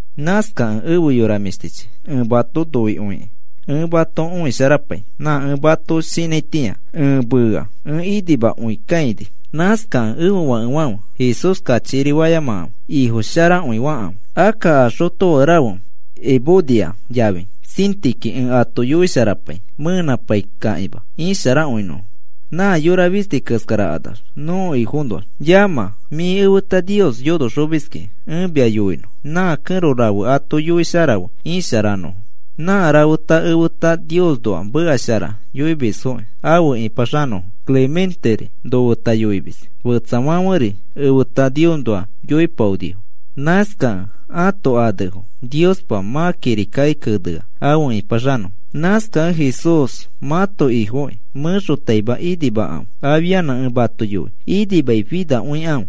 Nãskakẽ efe yora mĩshtichi, ẽ mato noikõikĩ ẽ mato õisharapai. Nã ẽ mato shinãitĩa ẽ mea ẽ inimakõikakãini. Nãskakẽ ẽfe fakefãfe, Jesús kachikiri fayamakãfe. Ifo sharakõi fakãfe. Akka a xotofake rafe Evodia yafi Síntiqui ẽ ato yoisharapai mẽnãpaikakĩma isharakõinõfo nã yora fisti keskarakanax nõko Ifoõnoax. Yamã, mĩ efeta Nios yonoxomiskĩ, ẽ mia yoinõ nã kẽro rafe ato yoisharafe isharanõfo. Nã rafeta efeta Niosnoa meka shara yoimisfoki afe ĩpaxanõfo. Clementeri nofeta yoimis. Fetsafãferi efeta Niosnoa yoipaonifo. Nãskakẽ ãto anefo Niospa mã kirikaki kenea afe ĩpaxanõfo. Nãskakẽ Jesús mãto Ifokĩ mẽxotaima inimakãfe. Afianã ẽ mato yoi, inimaifinakõikãfe.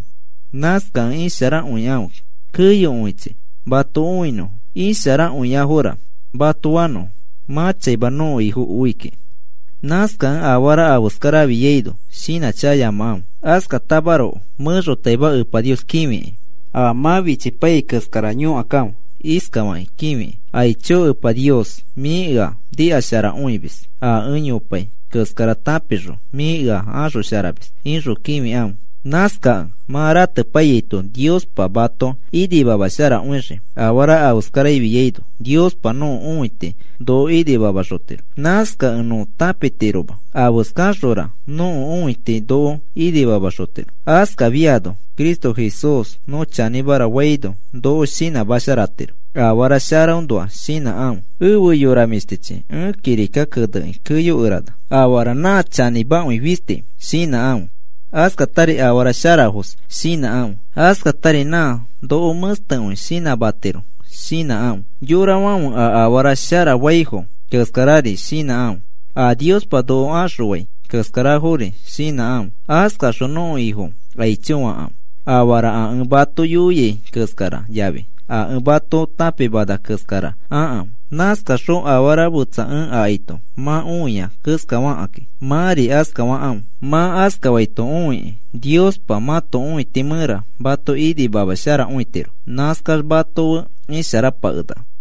Nãskakẽ isharakõikãfe keyokõichi mato õinõfo, isharakõiafora mato fanõfo. Mã chaima nõko Ifo oi kiki. Nãskakẽ afara afeskara afiaino shinãchakayamakãfe, askatamaroko mẽxotaima Epa Nios kĩfiki. A mã fichipaiyai keskara yõkakãfe iskafakĩ kĩfikĩ: “Aicho Epa Nios, mĩ ea nikasharakõimis. A ẽ yopai keskara tãpixõ mĩ ea axosharamis,” ixõ kĩfikãfe. Nãskakẽ mã ratepaiyaito Niospa mato inimamasharakõixii. Afara afeskara ifiaino Niospa nõko õiti noko inimamaxotiro. Nãskakẽ nõ tãpitiroma afeskaxora nõko õiti noko inimamaxotiro. Askafiano Cristo Jesús nõ chanĩmara faino noko shinãmasharatiro. Afara sharafoõnoa shinãkãfe. Efe yora mĩshtichi, ẽ kirika kenekĩ keyokerana. Afara nã chanĩmakõi fisti shinãkãfe, askatari afara sharafos shinãkãfe, askatari nã noko mẽstekõi shinãmatiro shinãkãfe, yorafãfe a afara sharafaifo keskarari shinãkãfe, a Niospa noko axõai keskarafori shinãkãfe. Askaxõ nõko Ifo aicho fakãfe. Afara a ẽ mato yoiai keskara yafi a ẽ mato tãpimana keskara akãfe. Nãskaxõ afara fetsa ẽ akaito mã õia keskafakĩ, mãri askafakãfe. Mã askaito õikĩ Niospa mãto õiti mẽra mato inimamasharakõitiro. Nãskax mato fe isharapakenaka.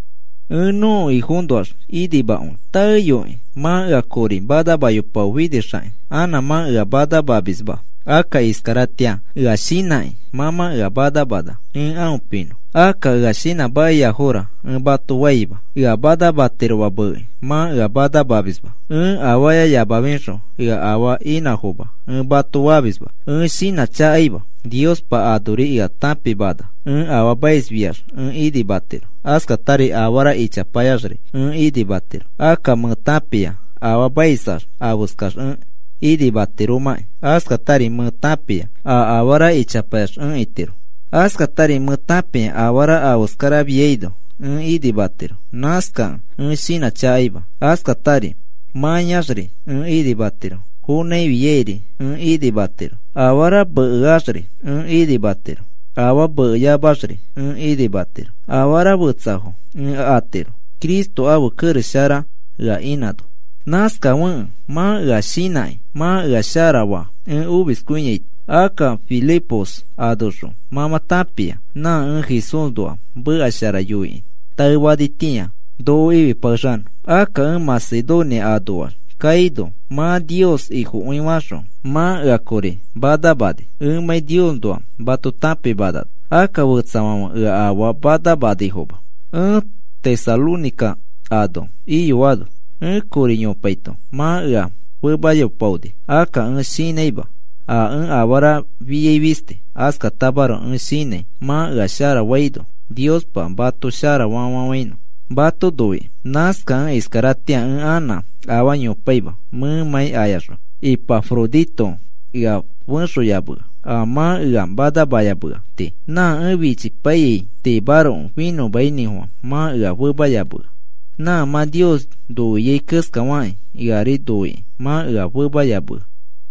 Ẽ nõko Ifoõnoax inimakõi, taeyoi mã ea kori manamayopaofinixakĩ anã mã ea manamamisma. Akka iskaratĩa ea shinãkĩ mã mã ea manamana ẽ aõ pinõ. Akka ea shinãmakiafora ẽ mato faima, ea manamatiroma meekĩ mã ea manamamisma. Ẽ afaayayamafixõ ea afaa inãfoma ẽ mato famisma. Ẽ shinãchakaima, Niospa anori ea tãpimana. Ẽ afaamais fiax ẽ inimatiro, askatari afara ichapayax ẽ inimatiro. Akka mẽ tãpia afaamaisax afeskax ẽ itiromãki. Askatari mẽ tãpia a afara ichapayax ẽ itiro. Askatari mẽ tãpia afara afeskara ifiaino ẽ inimatiro. Nãskakẽ ẽ shinãchakaima. Askatari mãyaxri ẽ inimatiro, fonãifiairi ẽ inimatiro. Afara mekefaxri ẽ inimatiro, afaa meke fayamafiaxri ẽ inimatiro. Afara fetsafo ẽ atiro Cristo ãfe kerex shara ea inãno. Nãskafekẽ mã ea shinãkĩ mã ea sharafa ẽ omiskõiaito. Akka Filipos anoxõ mã mã tãpia, nã ẽ Jesúsnoa meka shara yoikĩ taefanitĩa noko ifipakexanõ. Akka ẽ Macedonia anoax kaino, mã Nios Ifokõifaxõ, mã ea kori manamani, ẽmãi Niosnoa mato tãpimanano. Akka fetsafãfe ea afaa manamanifoma. Ẽ Tesalónica ano iyoano, ẽ kori yopaito mã ea femayopaoni. Akka ẽ shinãima a ẽ afara fiai fisti. Askatamaroko ẽ shinãi mã ea sharafaino Niospa mato sharafa fafafãinõ, mato noikĩ. Nãskakẽ iskaratĩa ẽ anã afaa yopaima, mẽmãi ayaxõ. Ipafrodito ea fexoyamea a mã ea manamayamea tii. Nã ẽ fichipaiyai tiimaroko finõmainĩfofã mã ea femayamea. Nã mã Nios noiai keskafakĩ eari noikĩ mã ea femayamea.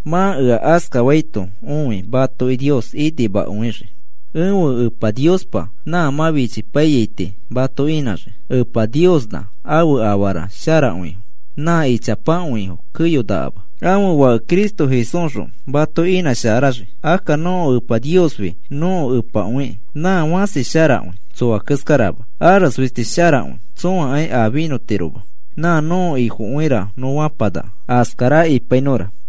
Mã ea askafaito õi matoki Nios inimakõixii. Ẽfe Niospa nã mã fichipaiyai tii mato inãxii. Epa Niosnã ãfe afara sharakõifo nã ichapakõifo keyonakama, ãfe Fake Cristo Jesúsxõ mato inãsharaxii. Akka nõko Epa Niosfi nõko Epakõikĩ nã fãsi sharakõi, tsoa keskarama. Ares fisti sharakõi. Tsõakai a finõtiroma. Nã nõko Ifokõira nõ fapanaka. Askara ipainõra.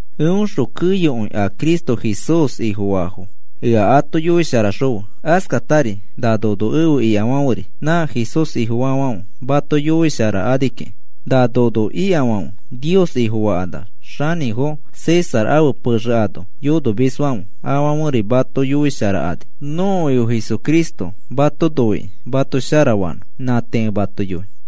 Eõxõ keyokõi a Cristo Jesús Ifofaafo ea ato yoisharaxokãfe. Askatari na nono efe ikafãferi nã Jesús Ifofaafãfe mato yoisharakani kiki. Na nono ikafãfe Nios Ifofakanax, xanĩfo César ãfe pexe ano yonomisfãfe afãferi mato yoisharakani. Nõko Ifo Jesucristo mato noikĩ mato sharafanõ. Nã tii ẽ mato yoi. Pablo